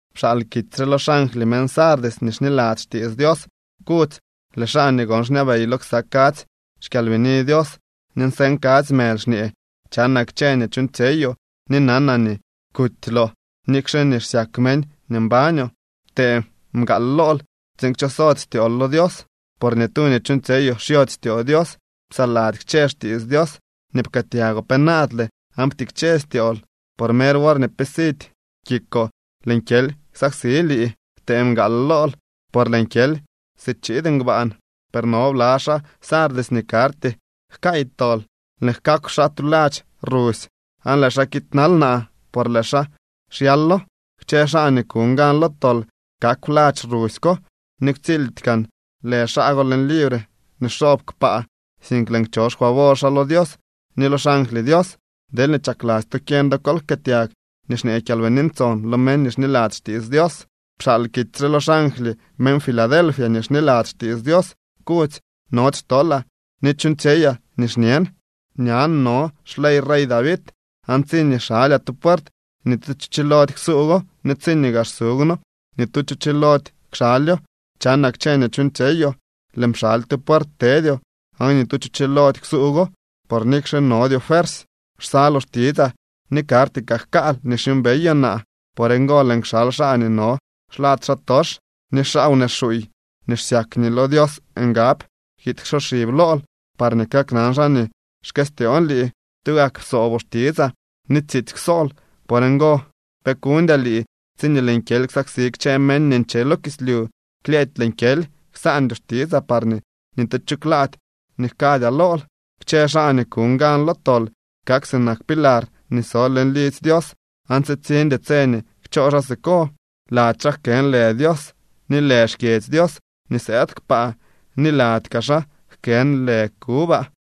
’Pxaal kitsy re lo xangly meñ Sardis nii xniladzy xtiits Dios, kudzy: “Lëë xaa nii gon xñabey lo ksa kadzy xkyalbini Dios ni nseñ kadzy mëly xñee: Chanaa kchë nii chuuñtsyeyoo ni nanaa nii kutyloo nikxe nii xsyak meñ nii mbañoo. Ptee mgaal lool tsiin kchosody styool lo Dios, por ni tu nii chuuñtsyeyoo xyody styoo Dios. Psaladzy kchë xtiits Dios nii pkëëtyagoo penaadle aan ptikche styool. Por mer worñee pe sidy kikoo lëën kyely ksaksi lii. Ptee mgaal lool por lëën kyely si chiid ngbaan. Per no bla xaa Sardis nii karty jkaay tol. Lëën jkaakw xaa tu ladx rusy aan lëë xaa kiidnal naa por lëë xaa xyalo. Kchë xaa nii kuñ gan lo tol kakw ladx rusy ko ni ktsildy gaan lë xaa go leñ libre nii xoob kpaa, sink lëën kcho xfavor xaa lo Dios ni lo xangly Dios. Deelñee chakladzy to kyeñ do, kol jkëëtyag nii xñee Kyalbini Ntson lo meñ nii xniladzy xtiits Dios.” ’Pxaal kitsy re lo xangly meñ Filadelfia nii xniladzy xtiits Dios, kudzy: “Nody xtolaa ni chuuñtsyeyaa nii xñen. Ñan no xlyey rey David aan tsiñee xalyaa tu puert ni tu cho chilody ksuugwo ni tsiñee gaa xsuugwno ni tu cho chilody kxalyo. Chanaa kchë nii chuuñtsyeyoo. Lëën pxaly tu puert tedyoo aan ni tu cho chilody ksuugwo, por nikxe nodyoo fuersy, xsaloo xtitsaa ni karty kaa jkaal nii xyuumbeyoo naa. Por ngo lëën kxal xaa nii no xlad xaatox, ni xaa wnee xuuy nii xsyak nii lo Dios ngab kiid ksoxib lool parñee kaknan xaa nii xkëstyoon lii. Tugak psooboo xtitsaa ni tsiitsy kwsool. Por ngo pe kuñdyaa lii tsiñee lëën kyely ksaksi kchë meñ nii nche lo kislyu. Klyëëdy lëën kyely. Ksaandyoo xtitsaa parñee ni tu cho klaady nii jkadyaa lool. Kchë xaa nii kuñ gan lo tol kak sinak pilar nii so leñ lidzy Dios aan tsitsiñdy tse nii kchoo xaa siko. Lady xaa jkën lë Dios ni lë xkyedzy Dios nii sëëd kpaa, ni lady kaa xaa jkën lë kubaa.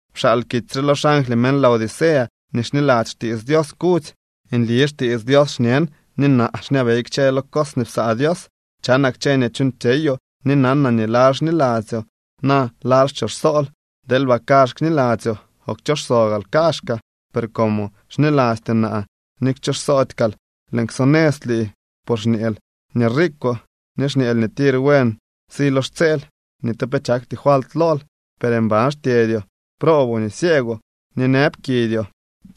’Pxaal kitsy re lo xangly meñ Laodicea nii xniladzy xtiits Dios, kudzy: “Nli xtiits Dios xñen, ni naa xñabey kchë lo cos nii psaa Dios. Chanaa kchë nii chuuñtsyeyoo ni nanaa nii laal xniladzyoo, na laal xchooxsol. ¡Deelba kazh kniladzyoo o kchooxso gaal kaazhkaa! Per como xnilastyoo naa ni xchooxsody kaal, lëën ksonëz lii. Por xñeel nii riikwoo ni xñeel nii tir buen si lo xtseel. Ni tu pe chakty falt lool. Per mban xtyedyoo, prooboo ni cieegwoo. Ni nëb kidyoo.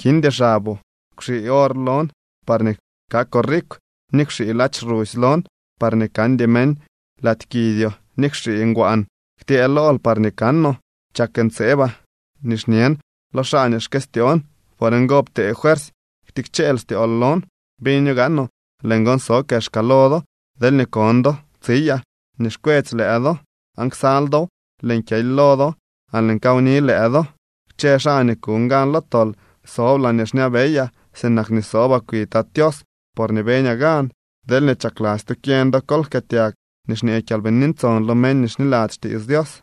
Kindy xaboo. Kwxii or lon parñee kakoo rikw ni kwxii ladx rusy lon parñee kandy meñ lady kidyoo ni kwxii ngwaan ktyëë lool parñee kanoo. Chak ntseebaa ni xñen lo xaa nii xkëstyoon. Por ngo, ptee fuersy ktikcheel styool lon. Biño gaanoo lëën gon so kexka lo do. Deelñee kon do tsiyaa nii xkwetsy lëë do aan ksal dow, lëën kyely lo do aan lëën kawni lëë do. Kchë xaa nii kuñ gan lo tol sob laañee xñabeyaa sinak nii sobaa kwi Tat Tios porñee beñaa gan. Deelñee chakladzy to kyeñ do, kol jkëëtyag nii xñee Kyalbini Ntson lo meñ nii xniladzy xtiits Dios.”